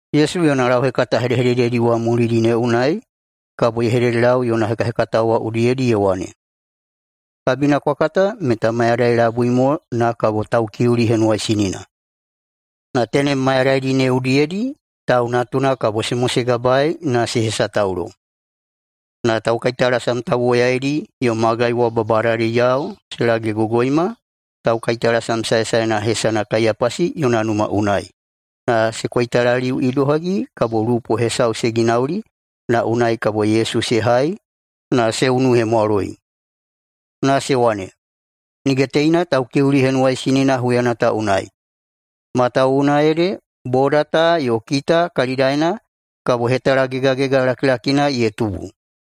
Yesu yona lauhekata hedehedededi wa mulidi ne unai kabo ye hededelau yona hekahekatao wa udiyedi ye wane, “Kabina kwa kata meta mayadai labui mo na kabo Taukiuli Henuwaisinina, na tenem mayadaidi ne udiyedi Tau Natuna kabo se mosegabaei na se hesataulo.” Na taukaitalasam tauwoyaidi yo magai wa babadadiyao se lagegogoima taukaitalasam saesaena hesana Kaiyapasi yona numa unai, na se koitalaliu idohagi kabo lupo hesau se ginauli na unai kabo Yesu se hai na se unuhemwaloi. Na se wane, “Nige teina Taukiuli Henuwaisinina huyana ta unai, matawuwuna ede boda ta yo kita kalidaena kabo hetalagegagega lakilakina ye tubu.”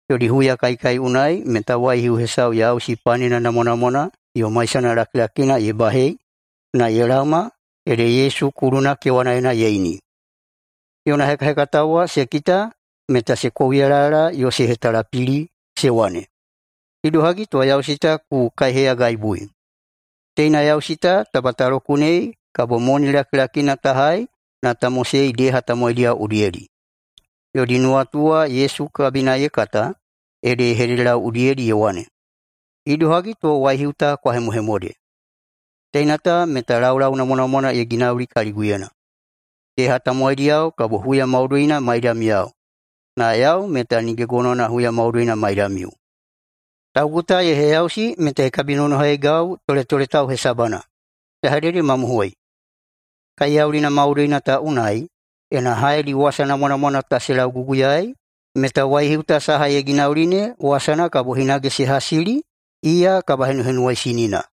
Yodi huyakaikai unai meta waihiu hesau yausi panena namwanamwana yo maisana lakilakina ye bahei na ye laoma ede Yesu kuluna kewanaena ye ini. Yona hekahekatao wa se kita meta se kouyalayala yo se hetalapili, se wane, “Idohagi to yausi ta ku kaiheyagaibui. Teina yausi ta taba ta lokunei kabo moni lakilakina ta hai na ta mosei deha tamowaidiyao udiyedi.” Yodi nuwatu wa Yesu kabina ye kata ede ye hededelau udiyedi ye wane, “Idohagi to waihiu ta kwa hemohemode. Teina ta meta laulau namwanamwana ye ginauli kaliguyena. Deha tamowaidiyao kabo huya maudoina maidamiyao, na yau meta nige gonowana huya maudoina maidamiu. Taugu ta ye heyausi meta ye kabinonohaigau toletoletau hesabana. Ya hededemamohoi: Kaiyaulina maudoina ta unai, ena haedi wasa namwanamwana ta se lauguguyaei, meta waihiu ta saha ye ginauli ne wasana kabo hinage se hasili iya kabahenuhenuwaisinina.”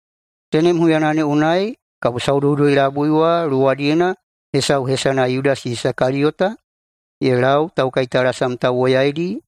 Tenem huyana ne unai kabo saudoudoi-labui wa luwadiyena hesau hesana Yudasi Isakaliyota ye lau taukaitalasam tauwoyaidi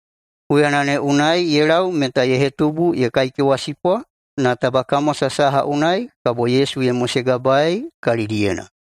Huyana ne unai ye lau meta ye hetubu ye kaikewasipwa na taba kamwasa saha unai kabo Yesu ye mosegabaei kalidiyena.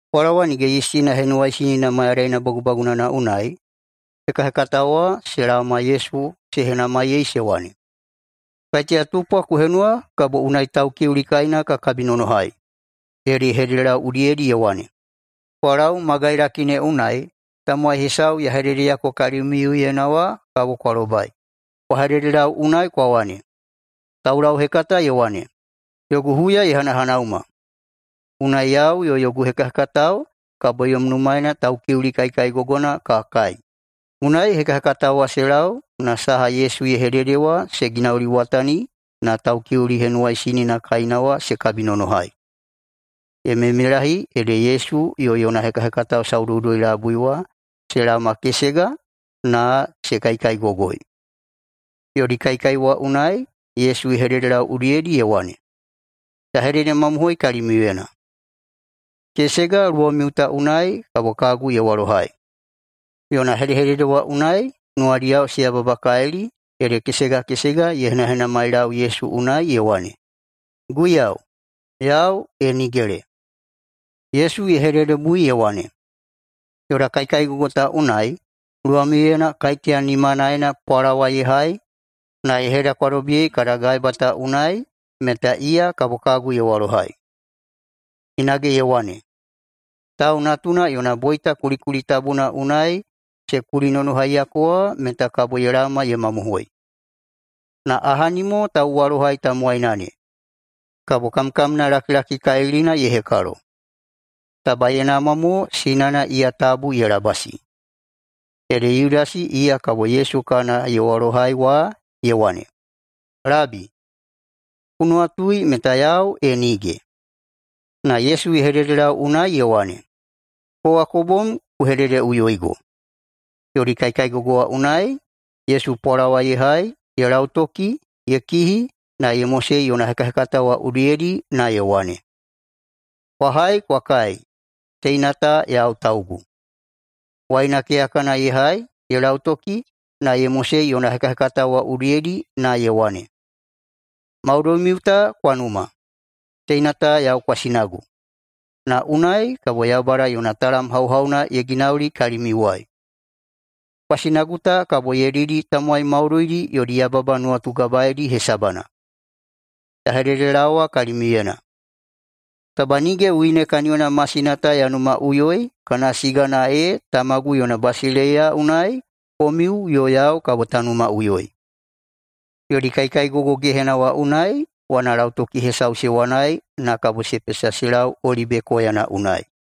Pwalawa Nige Yistina Henuwaisinina mayadaina bagubagunana unai, hekahekatao wa se laoma Yesu se henamaiyei se wane, “Kaiteya tupwa ku henuwa kabo unai Taukiuli kaina ka kabinonohai?” Ede ye hededelau udiyedi ye wane, “Kwa lau magailaki ne unai tamowai hesau ya hededeyako kalimiuyena wa kabo kwa lobai. Kwa hededelau unai kwa wane, ‘Taulauhekata ye wane, “Yogu huya ye hanahanauma. Unai yau yo yogu hekahekatao kabo yom numaena Taukiuli kaikaigogona ka kai.”’” Unai hekahekatao wa se lau na saha Yesu ye hedede wa se ginauliwatani na Taukiuli Henuwaisinina kaina wa se kabinonohai. Ye meimeilahi ede Yesu yo yona hekahekatao saudoudoi-labui wa se laomakesega na se kaikaigogoi. Yodi kaikai wa unai Yesu ye hededelau udiyedi ye wane, “Ya hededemamohoi kalimiuyena: Kesega luwamiu ta unai kabo kagu ye walohai.” Yona hedehedede wa unai nuwadiyao se yababakalili ede kesega kesega ye henahenamailau Yesu unai ye wane, “Guiyau, yau, e nigele?” Yesu ye hededebui ye wane, “Yoda kaikaigogo ta unai luwamiuyena kaiteya nimanaena pwalawa ye hai na ye hedakwadobiyei kada gaeba ta unai meta iya kabo kagu ye walohai.” [Hinage ye wane,] “Tau Natuna yona boita kulikuli tabuna unai se kulinonohaiyako wa meta kabo ye laoma ye mamohoi. Na ahani mo tauwalohai tamowaina ne, kabo kamkamna lakilakikalilina ye hekalo. Taba ye namwa mo sinana iya tabu ye labasi.” Ede Yudasi iya kabo Yesu kana ye walohai wa ye wane, “Labi, ku nuwatui meta yau, e nige?” Na Yesu ye hededelau unai ye wane, “Kowa ku bom ku hededeꞌuyoigo.” Yodi kaikaigogo wa unai, Yesu pwalawa ye hai, ye lautoki, ye kihi, na ye mosei yona hekahekatao wa udiyedi na ye wane, “Kwa hai kwa kai, teina ta yau taugu.” Waina keyakana ye hai, ye lautoki, na ye mosei yona hekahekatao wa udiyedi na ye wane, “Maudoimiu ta kwa numa. Teina ta yau kwasinagu, na unai kabo Yaubada yona talam hauhauna ye ginauli kalimiuwai. Kwasinagu ta kabo ye didi tamowai maudoidi yodi yababa nuwatugabaedi hesabana. Ya hededelaowa kalimiuyena, taba nige wine kaniyona masina ta ya numaꞌuyoi kana sigana ee Tamagu yona basileiya unai komiu yo yau kabo ta numaꞌuyoi.” [Yodi kaikaigogo gehena wa unai] wanalautoki hesau se wanai na kabo se pesa se lau Olibe koyana unai.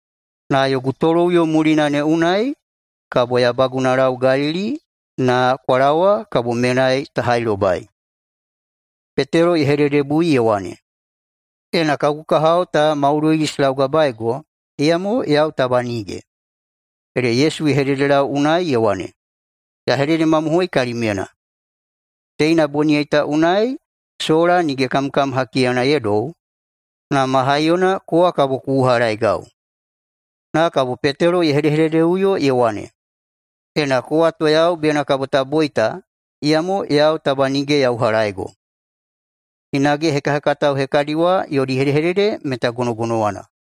Na yogu toloꞌuyo mulina ne unai kabo ya bagunalau Galili [na kwa laowa kabo menai ta hailobai].” Petelo ye hededebui ye wane, “Ena kagu kahao ta maudoidi se laugabaego, iyamo yau taba nige.” Ede Yesu ye hededelau unai ye wane, “Ya hededemamohoi kalimyena: Teina boniyai ta unai sola nige kamkam hakiyana ye dou, na ma haiyona kowa kabo ku uhalaeigau.” Na kabo Petelo ye hedehededeꞌuyo ye wane, “Ena kowa to yau bena kabo ta boita, iyamo yau taba nige ya uhalaeigo!” Hinage hekahekatao hekadi wa yodi hedehedede meta gonogonowana.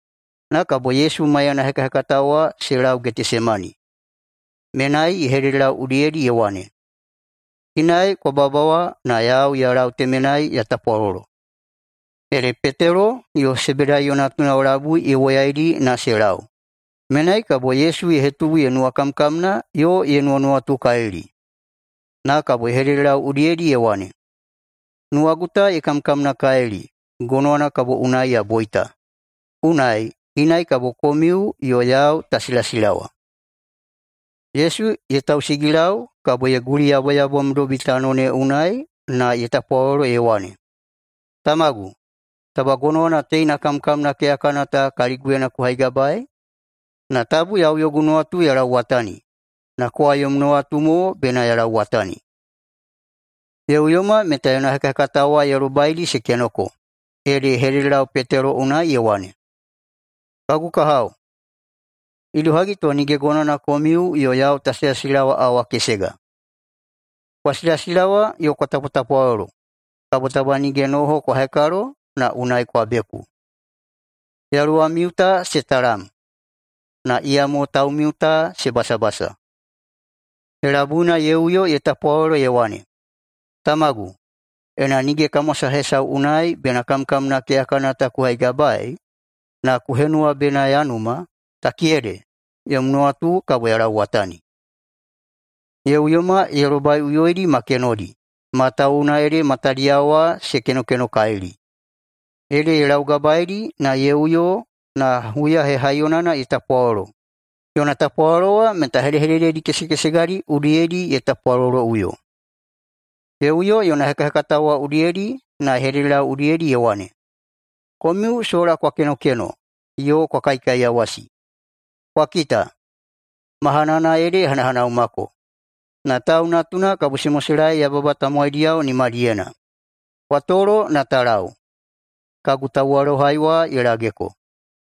Na kabo Yesu maiyana hekahekatao wa se lau Getesemani. Menai ye hededelau udiyedi ye wane, “Inai kwa babawa na yau ya lau temenai ya tapwalolo.” Ede Petelo yo Sebedaiyo natunao labui ye woyaidi na se lau. Menai kabo Yesu ye hetubu ye nuwakamkamna yo ye nuwanuwatukalili. Na kabo ye hededelau udiyedi ye wane, “Nuwagu ta ye kamkamnakalili gonowana kabo unai ya boita, unai inai kabo komiu yo yau ta silasilawa.” Yesu ye tausigilau kabo ye guliyaboyabomdobi tano ne unai na ye tapwalolo ye wane, “Tamagu, taba gonowana teina kamkamna keyakana ta kaliguyena ku haigabaei. Na tabu yau yogu nuwatu ya lauwatani, na kowa yom nuwatu mo bena ya lauwatani.” Ye uyoma meta yona hekahekatao wa ye lobaidi se kenoko, ede ye hededelau Petelo unai ye wane, “[Kagu kahao,] idohagi to nige gonowana komiu yo yau ta silasilawa awa kesega? Kwa silasilawa yo kwa tapwatapwalolo, kabo taba nige noho kwa hekalo na unai kwa beku. Yaluwamiu ta se talam, na iyamo taumiu ta se basabasa.” Helabuina ye uyo ye tapwalolo ye wane, “Tamagu, ena nige kamwasa hesau unai bena kamkamna keyakana ta ku haigabaei, na ku henuwa bena ya numa, takiyede yom nuwatu kabo ya lauwatani.” Ye uyoma ye lobaiꞌuyoidi ma kenodi, matawuwuna ede matadiyao wa se kenokenokalili. Ede ye laugabaeidi na ye uyo na huya hehaiyonana ye tapwalolo, yona tapwalolo wa meta hedehedededi kesekesegadi udiyedi ye tapwaloloꞌuyo. Ye uyo yona hekahekatao wa udiyedi na ye hededelau udiyedi ye wane, “Komiu sola kwa kenokeno yo kwa kaikaiyawasi? Kwa kita, mahanana ede ye hanahanaumako, na Tau Natuna kabo se moselaei yababa tamowaidiyao nimadiyena. Kwa tolo na ta lau, kagu tauwalohai wa ye lageko.”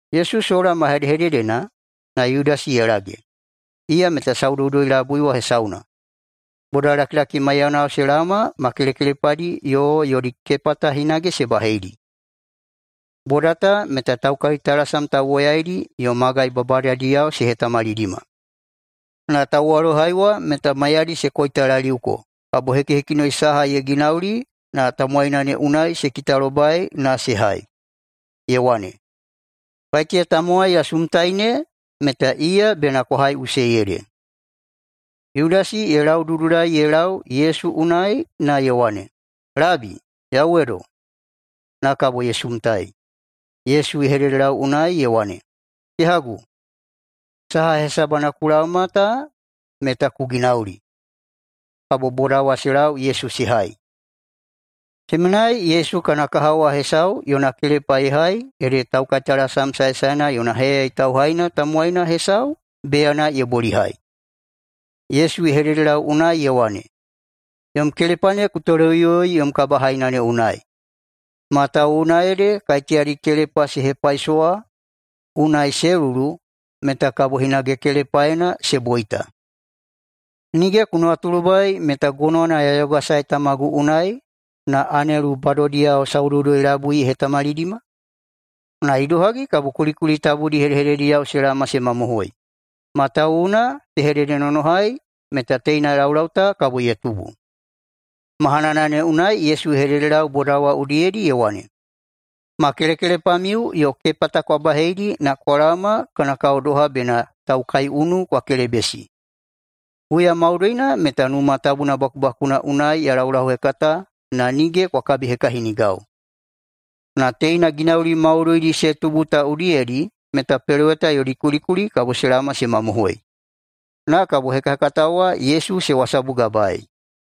Yesu sola ma hedehededena, na Yudasi ye lage, iya meta saudoudoi-labui wa hesauna. Bodalakilaki maiyanao se laoma ma kelekelepadi yo yodi kepata hinage se baheidi. Boda ta meta taukaitalasam tauwoyaidi yo magai babadadiyao se hetamalidima. Na tauwalohai wa meta maiyadi se koitalaliuko kabo hekihekinoi saha ye ginauli na tamowaina ne unai se kitalobai na se hai, ye wane, “Kaiteya tamowai ya sumtai ne meta iya bena kwa haiꞌusei ede.” Yudasi ye laududulai ye lau Yesu unai na ye wane, “Labi, yauwedo!” na kabo ye sumtai. Yesu ye hededelau unai ye wane, “Kehagu, saha hesabana ku laoma ta meta ku ginauli!” Kabo boda wa se lau Yesu se hai. Temenai Yesu kana kahao wa hesau yona kelepa ye hai ede taukaitalasam saesaena yona heyayai tauhaina tamowaina hesau beyana ye bolihai. Yesu ye hededelau unai ye wane, “Yom kelepa ne ku toleꞌuyoi yom kabahaina ne unai, matawuwuna ede kaiteyadi kelepa se hepaisowa unai se lulu meta kabo hinage kelepaena se boita. Nige ku nuwatulobai meta gonowana ya yogasae Tamagu unai na anelu bodadiyao saudoudoi-labui ye hetamalidima? Na idohagi kabo kulikuli tabudi hedehededediyao se laoma se mamohoi, matawuwuna se hededenonohai meta teina laulau ta kabo ye tubu.” Mahanana ne unai Yesu ye hededelau boda wa udiyedi ye wane, “Ma kelekelepamiu yo kepata kwa baheidi na kwa laoma, kana kao doha bena taukaiunu kwa kelebesi. Huya maudoina meta Numa Tabuna bakubakuna unai ya laulauhekata na nige kwa kabihekahinigau. Na teina ginauli maudoidi se tubu ta udiyedi meta Peloweta yodi kulikuli kabo se laoma se mamohoi.” Na kabo hekahekatao wa Yesu se wasabugabaei.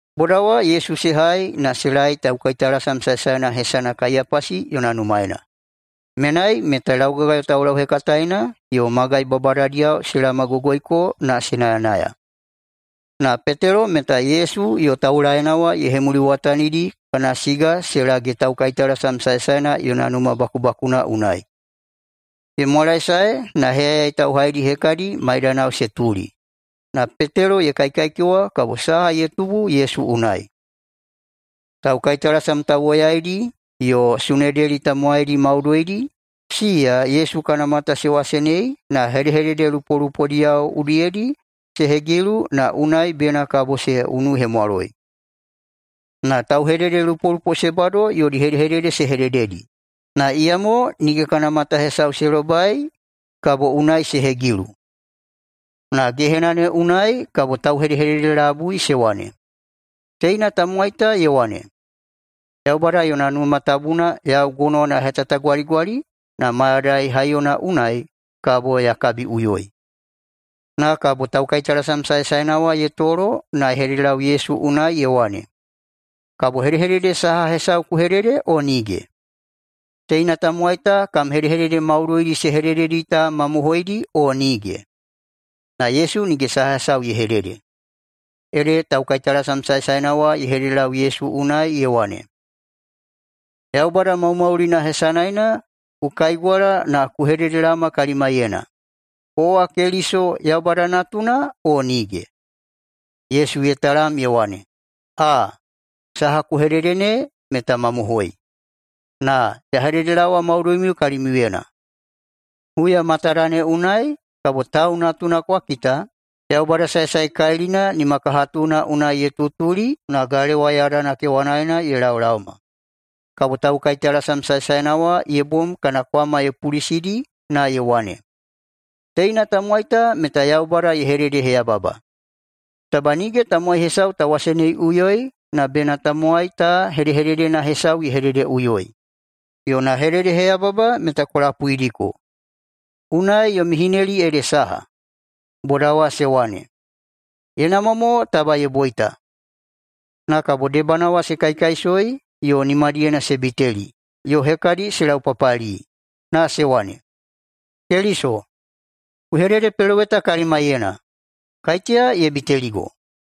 Boda wa Yesu se hai na se laei taukaitalasam saesaena hesana Kaiyapasi yona numaena. Menai meta laugagayo taulauhekataena yo magai babadadiyao se laomagogoiko na se nayanaya. Na Petelo meta Yesu yo taulaeina wa ye hemuliwatanidi kana siga se lage taukaitalasam saesaena yona numa bakubakuna unai. Ye mwalaesae na heyayai tauhaidi hekadi maidanao se tuli, na Petelo ye kaikaikewa kabo saha ye tubu Yesu unai. Taukaitalasam tauwoyaidi yo Sunedeli tamowaidi maudoidi, siya Yesu kana mata se wasenei na hedehedede lupolupodiyao udiyedi se hegilu na unai bena kabo se unuhemwaloi. Na tauhededelupolupo se bado yodi hedehedede se hedededi, na iyamo nige kana mata hesau se lobai kabo unai se hegilu. Na gehena ne unai kabo tauhedehedede labui se wane, “Teina tamowai ta ye wane, ‘Yaubada yona Numa Tabuna yau gonowana ya hetatagwaligwali na mayadai haiyona unai kabo ya kabiꞌuyoi.’” Na kabo taukaitalasam saesaena wa ye tolo na ye hededelau Yesu unai ye wane, “Kabo hedehedede saha hesau ku hedede o nige? Teina tamowai ta kam hedehedede maudoidi se hedededi ta mamohoidi o nige?” Na Yesu nige saha hesau ye hedede. Ede taukaitalasam saesaena wa ye hededelau Yesu unai ye wane, “Yaubada maumaulina hesanaena ku kaigwala na ku hededelaoma kalimaiyena: Kowa Keliso, Yaubada Natuna, o nige?” Yesu ye talam ye wane, “Aa, saha ku hedede ne meta mamohoi, na ya hededelaowa maudoimiu kalimiuyena, huya matada ne unai kabo Tau Natuna kwa kita Yaubada Saesaekalilina nimakahatuna unai ye tutuli na galewa yadana kewanaena ye laolaoma.” Kabo taukaitalasam saesaena wa ye bom kana kwama ye pulisidi na ye wane, “Teina tamowai ta meta Yaubada ye hededeheyababa! Taba nige tamowai hesau ta waseneiꞌuyoi na bena tamowai ta hedehededena hesau ye hededeꞌuyoi. Yona hededeheyababa meta kwa lapuidiko. Unai yomi hineli ede saha?” Boda wa se wane, “Ye namwa mo taba ye boita.” Na kabo debana wa se kaikaisoi yo nimadiyena se biteli, yo hekadi se laupapali na se wane, “Keliso, ku hededepeloweta kalimaiyena, kaiteya ye biteligo?”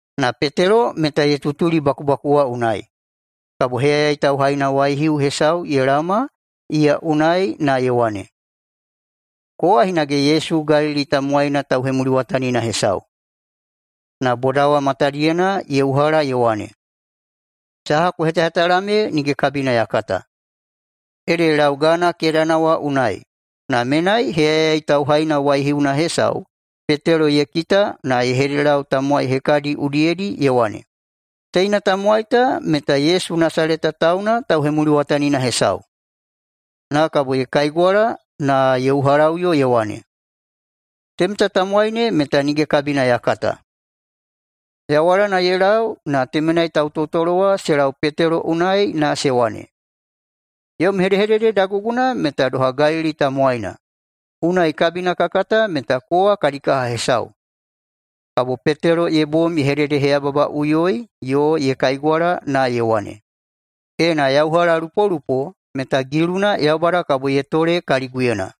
Na Petelo meta ye tutuli bakubaku wa unai, kabo heyayai tauhaina waihiu hesau ye laoma iya unai na ye wane, “Kowa hinage Yesu Galili tamowaina tauhemuliwatanina hesau.” Na boda wa matadiyena ye uhala ye wane, “Saha ku hetahetala me nige kabina ya kata.” Ede ye lau gana kedana wa unai, na menai heyayai tauhaina waihiuna hesau Petelo ye kita na ye hededelau tamowai hekadi udiyedi ye wane, “Teina tamowai ta meta Yesu Nasaleta tauna tauhemuliwatanina hesau.” Na kabo ye kaigwala na ye uhalaꞌuyo ye wane, “Temeta tamowai ne meta nige kabina ya kata.” Yawalana ye lau na temenai tautotolo wa se lau Petelo unai na se wane, “Yom hedehedede daguguna meta doha Galili tamowaina, unai kabina ka kata meta kowa kadi kaha hesau.” Kabo Petelo ye bom ye hededeheyababaꞌuyoi yo ye kaigwala na ye wane, “[Ena ya uhalalupolupo meta giluna Yaubada kabo ye tole kaliguyena.]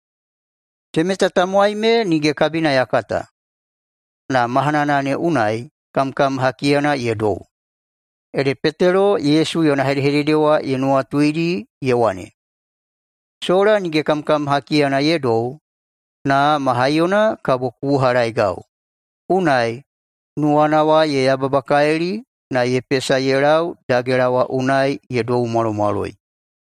Temeta tamowai me nige kabina ya kata!” Na mahanana ne unai kamkam hakiyana ye dou. Ede Petelo Yesu yona hedehedede wa ye nuwatuidi ye wane, “Sola nige kamkam hakiyana ye dou na ma haiyona kabo ku uhalaeigau.” Unai nuwana wa ye yababakalili na ye pesa ye lau dagela wa unai ye doumwalomwaloi.